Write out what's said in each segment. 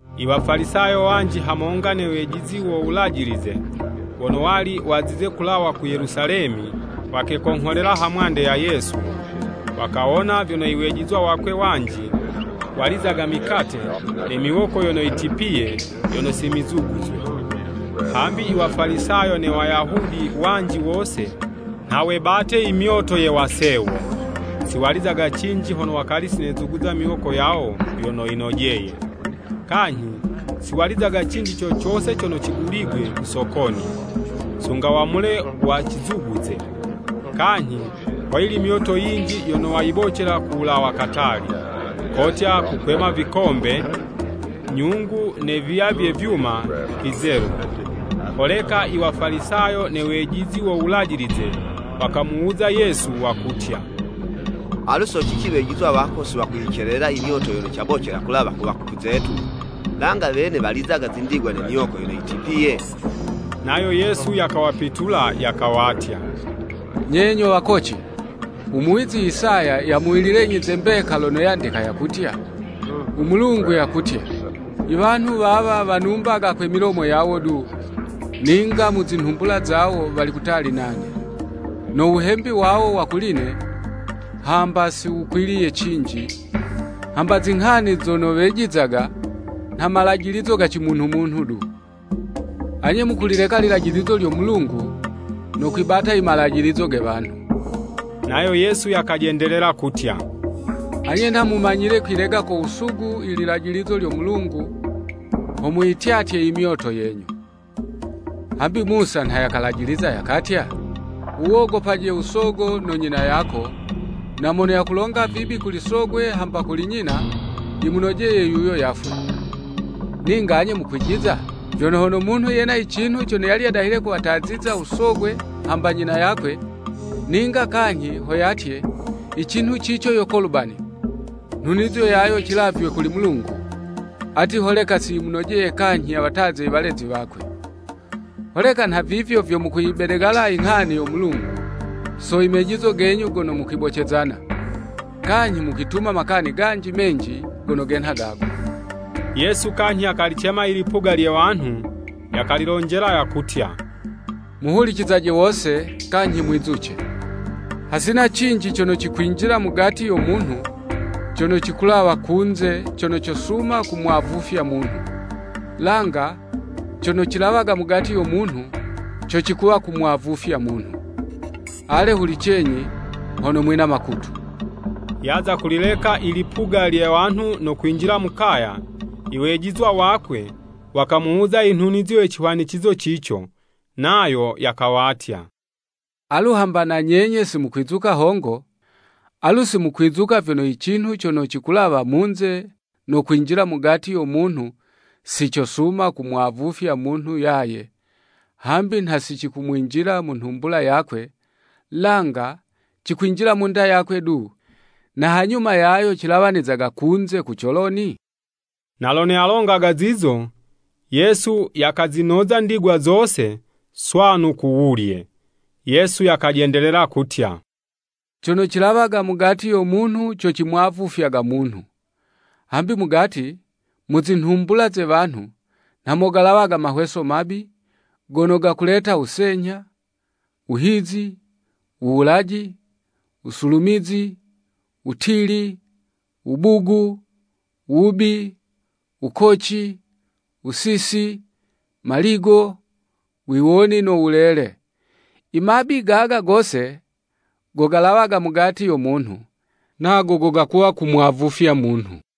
Iwafalisayo wanji hamonga ne wejizi wo Wulajilize, wono wali wazize kulawa ku Yelusalemi, wakekongholela ha mwande ya Yesu. Wakawona vyono iwejizwa wakwe wanji, walizaga mikate ne miwoko yono yitipiye, yono simizuguzwe. (Hambi Iwafalisayo ne Wayahudi wanji wose, nha webate imyoto ye wasewo: siwalizaga cinji, hono wakali sinezuguza miwoko yawo vyono yinojeye. Kanyhi, siwalizaga cinji co cose cono ciguligwe ku sokoni, sunga wamule wacizuguze. Kanyhi hoyili myoto yinji yono wayibocela kuwulawa katali, kotya kukwema vikombe, nyungu ne viya vye vyuma vizelu.) Holeka Iwafalisayo ne wejizi wo Wulajilize wakamuwuza Yesu, wakutya, “Alu so cici wejizwa wako siwakuyicelelela imyoto yono cayibocela kulawa ku wakuku zetu, langa wene walizaga zindigwa ne miwoko yono yitipiye?” Nayo Yesu yakawapitula yakawatya, “Nye nyo wakoci! Umuwizi Isaya yamuwililenyi ze mbeka lono yandika yakutya: ‘U Mulungu yakutya, I wanhu wawa wanumbaga kwe milomo yawo du, ninga mu zinhumbula zawo wali kutali nane. No wuhembi wawo wa kuli'ne hamba si wukwiliye cinji, hambi zinghani zono wejizaga, nha malajilizo ga cimunhu-munhu du.’ “Anye mukulileka lilajilizo lya Mulungu no kwibata imalajilizo ge wanhu.” Nayo Yesu yakajendelela kutya, “Anye nha mumanyile kwilega ko wusugu ililajilizo lyo Mulungu, ho muyityatye imyoto yenyu! Hambi Musa nha yakalajiliza yakatya, ‘Wuwogopaje Usogo no Nyina yako,’ na ‘Mono yakulonga vibi kuli sogwe hamba kuli nyina, yimunojeye yuyo yafwe.’ Ninga anye mukwijiza vyono, ‘Hono munhu yena icinhu cono yali yadahile kuwataziza usogwe hamba unyina yakwe, ninga kanyhi ho yatye, icinhu cico yo Kolubani (nhunizo yayo cilavywe kuli Mulungu), ati holeka si yimunojeye kanyhi yawataze i walezi wakwe.’ Holeka nhavivyo vyo mukuyibedegala inghani yo Mulungu, so imejizo genyu gono mukwibocezana. Kanyhi mukwituma makani ganji menji gono genha gago.” Yesu kanyhi yakalicema i lipuga lye wanhu, yakalilonjela yakutya, “Muhulicizaje wose, kanyhi mwizuce. Hasina cinji cono cikwinjila mugati yo munhu cono cikulawa munze cono cosuma kumwavufya munhu. Langa cono cilawaga mugati yo munhu co cikuwa kumwavufya munhu. [ Ale hulicenyi hono mwina makutu!]” Yaza kulileka i lipuga lye wanhu no kwinjila mu kaya, iwejizwa wakwe wakamuwuza inhunizo ye cihwanicizo cico. Nayo yakawatya, “Alu, hamba na nyenye simukwizuka hongo? Alu simukwizuka vyono i cinhu cono cikulawa munze no kwinjila mugati yo munhu si cosuma kumwavufya munhu yaye, hambi nha sicikumwinjila mu nhumbula yakwe, langa cikwinjila munda yakwe du, na hanyuma yayo cilawanizaga kunze ku coloni?” (Na lono yalongaga zizo, Yesu yakazinoza ndigwa zose, swanu ku wulye.) Yesu yakajendelela kutya, “Cono cilawaga mugati yo munhu co cimwavufya munhu. Hambi mugati, mu zinhumbula ze wanhu nha mo galawaga mahweso mabi, gono gakuleta wusenyha, wuhizi, wuwulaji, wusulumizi, wutili, wubugu, wubi, wukoci, wusisi, maligo, wiwoni no wulele. Imabi gaga gose, go galawaga mugati yo munhu, nago goga kuwa kumwavufya munhu.”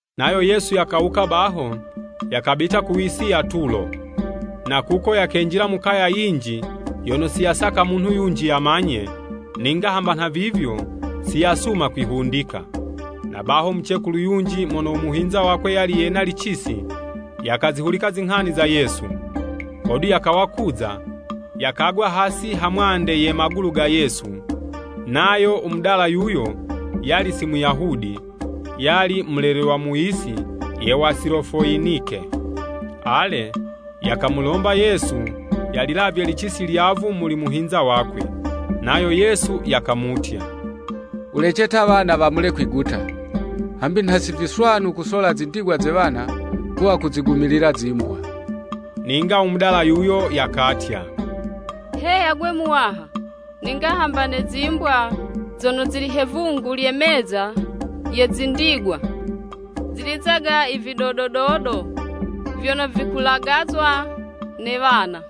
Nayo Yesu yakawuka baho, yakabita ku yisi ya Tulo. Na kuko yakenjila mu kaya yinji yono siyasaka munhu yunji yamanye, ninga hamba nhavivyo, siyasuma kwihundika. Na baho mucekulu yunji mono u muhinza wakwe yali yena licisi, yakazihulika zinghani za Yesu. Hodu yakawa kuza, yakagwa hasi ha mwande ye magulu ga Yesu. Nayo umudala yuyo, yali si Muyahudi, yali mulelelwa mu yisi ye Wasilofoyinike. Ale, yakamulomba Yesu yalilavye licisi lyavu muli muhinza wakwe. Nayo Yesu yakamutya, “Wulece ta wana wamule kwiguta, hambi nha si viswanu kusola zindigwa ze wana, kuwa kuzigumilila zimbwa.” Ninga umudala yuyo yakatya, “Heya 'gwe Muwaha, ninga hamba ne zimbwa zono zili he 'vungu lye meza ye zindigwa, zilizaga i vidodo dodo vyono vikulagazwa ne wana.”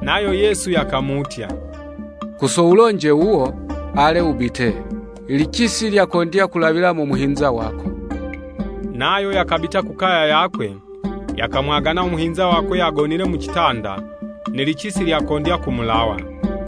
Nayo Yesu yakamutya, “Ku so wulonje wuwo, ale, wubite. Ilicisi lyakondya kulawila mo muhinza wako!” Nayo yakabita ku kaya yakwe, yakamwagana umuhinza wakwe yagonile mu citanda, ne licisi lyakondya kumulawa.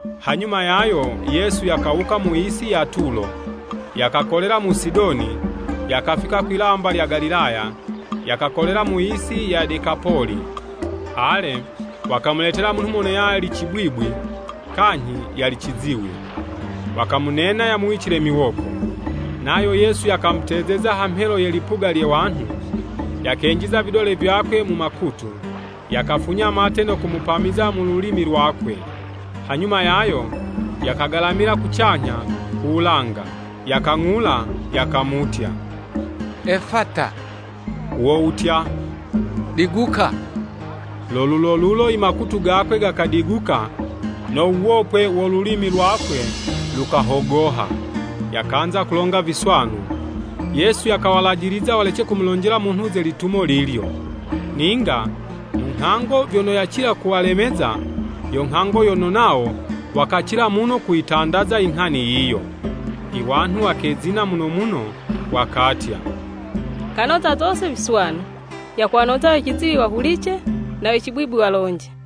Hanyuma yayo Yesu yakawuka mu'si ya Tulo, yakakolela mu Sidoni, yakafika kwi'lamba lya Galilaya, yakakolela mu'si ya Dekapoli. Ale, wakamuletela munhu mono yali cibwibwi kanyhi yali ciziwi, wakamunena yamuwicile miwoko. Nayo Yesu yakamutezeza ha mhelo ye lipuga lye wanhu, yakenjiza vidole vyakwe mu makutu, yakafunya mate no kumupamiza mu lulimi lwakwe. Hanyuma yayo yakagalamila kucanyha ku wulanga, yakang'ula, yakamutya, “Efata, wo wutya, Diguka.” Lo lulolulo imakutu gakwe gakadiguka no wuwopwe wo lulimi lwakwe lukahogoha, yakanza kulonga viswanu. Yesu yakawalajiliza walece kumulonjela munhu ze litumo lilyo. Ninga mu nghango vyono yacila kuwalemeza, yo nghango yono nawo wakacila muno kuyitandaza i nghani yiyo. I wanhu wakezina muno muno, wakatya, “Kanoza zose viswanu, yakuwanoza we ciziwi wahulice, na we cibwibwi walonje!”